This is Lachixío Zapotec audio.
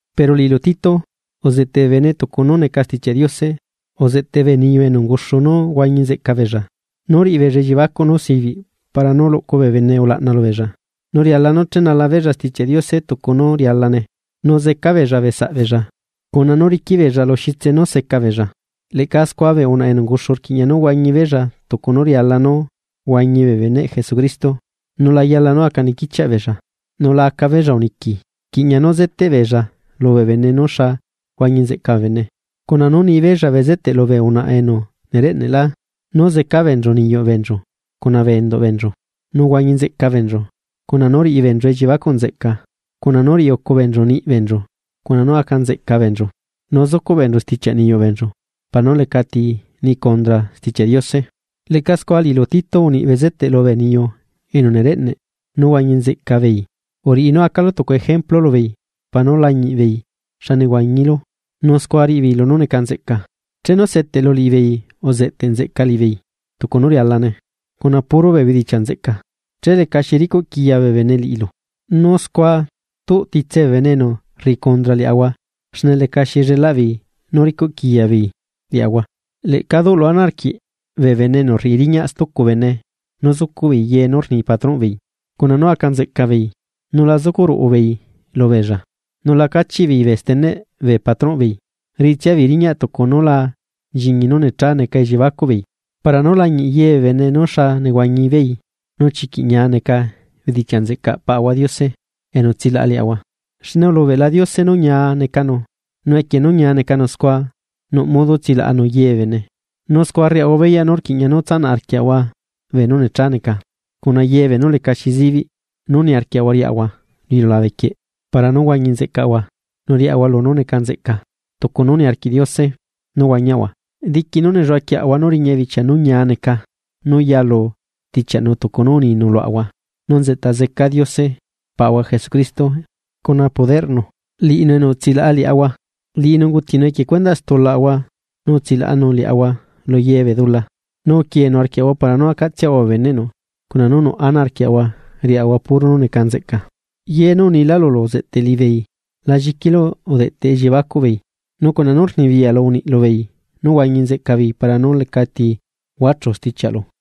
Pero liꞌilu Tito, uzeꞌteꞌ bee bene tucu nú neca Stichiaꞌ Diose. Uzeꞌteꞌ bee niyu enu unguxu nú huañi nzeꞌca beella, nú riꞌi beella elliebacuꞌ nú sibiꞌ para nú luꞌcu bee bene ulaꞌna lubeella. Nu riala nú chenala beella Stichiaꞌ Diose tucu nú rialane, nu zeca beella bee saꞌ beella, cuna nú riquiꞌ beella lu xitse nú seca beella. Leꞌca scua bee unaꞌa enu unguxu rquiꞌña nú huañi beella tucu nú riala nú huañi bee beneꞌ Jesucristo. Nu la yala nú aca niquichiaꞌ beella, nula aca beella uniqui. Rquiꞌña nú zeteꞌ beella lubee bene nú xa huañi nzeꞌca bee bene, cuna nú nibeella bezeteꞌ lubee unaꞌa enu nereꞌneꞌlá, nú zeca beenchu niyuꞌ beenchu cuna bee enduꞌ beenchu, nú huañi nzeꞌca beenchu, cuna nú riꞌi beenchu elliebacuꞌ nzeꞌca, cuna nú riꞌi ucu beenchu niꞌi beenchu cuna nú aca nzeꞌca beenchu, nu zucuꞌ beenchu stichiaꞌ niyuꞌ beenchu para nú lecati ni cundra Stichiaꞌ Diose. Leꞌca scua liꞌilu Tito, uniꞌ bezeteꞌ lubee niyu enu nereꞌneꞌ nú huañi nzeꞌca beei. Uriꞌi nú acalu tucu ejemplu lubeei para nu lañiꞌ beei xa nehuañilu, nu scua riꞌi beei lunú neca nzeꞌca. Chenu seteꞌlu liꞌibeei, uzeꞌteꞌ nzeꞌca liꞌibeei tucu nú rialane, cuna puro bee bedichiaꞌ nzeꞌca, che lecaxi ricuꞌquiya bee bene liꞌilu, nu scua tuꞌ titse bee bene enu rriꞌi cundra liaꞌahua xne lecaxi llelaꞌ beei nú ricuꞌquiya beei liaꞌahua. Leꞌca duꞌlu ana arquiꞌ bee bene enu rriꞌi riñaꞌ stucu bee bene nú zucuꞌ beei ye nú rni patronꞌ beei, cuna nú aca nzeꞌca beei nu la zucuꞌ ruꞌu beei lubeella. Nu la cachiꞌbeei bee steneꞌ bee patronꞌbeei, riꞌitsia beei riñaꞌ tucu nú la nchiñi nú necha neca elliebacuꞌbeei, para nú lañiꞌ ye bee bene nú xa nehuañi beei nu chiquiꞌ ñia neca bedichiaꞌ nzeꞌcaꞌ Paꞌahua Diose enu utsilaꞌa liaꞌahua. Xne ulubeꞌla Diose nú ñia necanu, nu equie nú ñia necanu scua, nuꞌ modo tsilaꞌanu ye bee bene. Nu scua rriaꞌahua beyaꞌ nú rquiꞌña nú tsanaꞌ arquiaꞌahua beenú necha neca, cuna ye beenú lecaxi zibiꞌ nú niarquiaꞌahua riaꞌahua lu iliulabequieꞌ para nú huañi nzeꞌcaꞌahua nu riaꞌahua lunú neca nzeꞌca, tucu nú niarquiꞌ Diose nú huañiaꞌahua, diqui nú nelluaꞌquieꞌahua nú riña bichia nú ñia neca nú yalu stichiaꞌnu tucu nú uninu luaꞌahua nú nzeꞌta zeca Diose Paꞌahua Jesucristo cuna poderꞌnu, liꞌinu enu utsilaꞌa liaꞌahua. Liꞌinu ungutinu equie cuendaꞌ stulaꞌahua nu utsilaꞌanu liaꞌahua lu ye bee dula, nu uquieenu arquiaꞌahua para nú acaꞌtsiaꞌahua bee beneꞌnu, cuna nú nuꞌ ana arquiaꞌahua riꞌahua puro nú neca nzeꞌca. Ye nú unilá lulu uzeꞌteꞌ liꞌibeei. La lliquilu udeꞌteꞌ elliebacuꞌ beei, nu cuna nú rnibiyaꞌlu uniꞌ lubeei nú huañi nzeꞌca beei para nú lecati huachu stichiaꞌlu.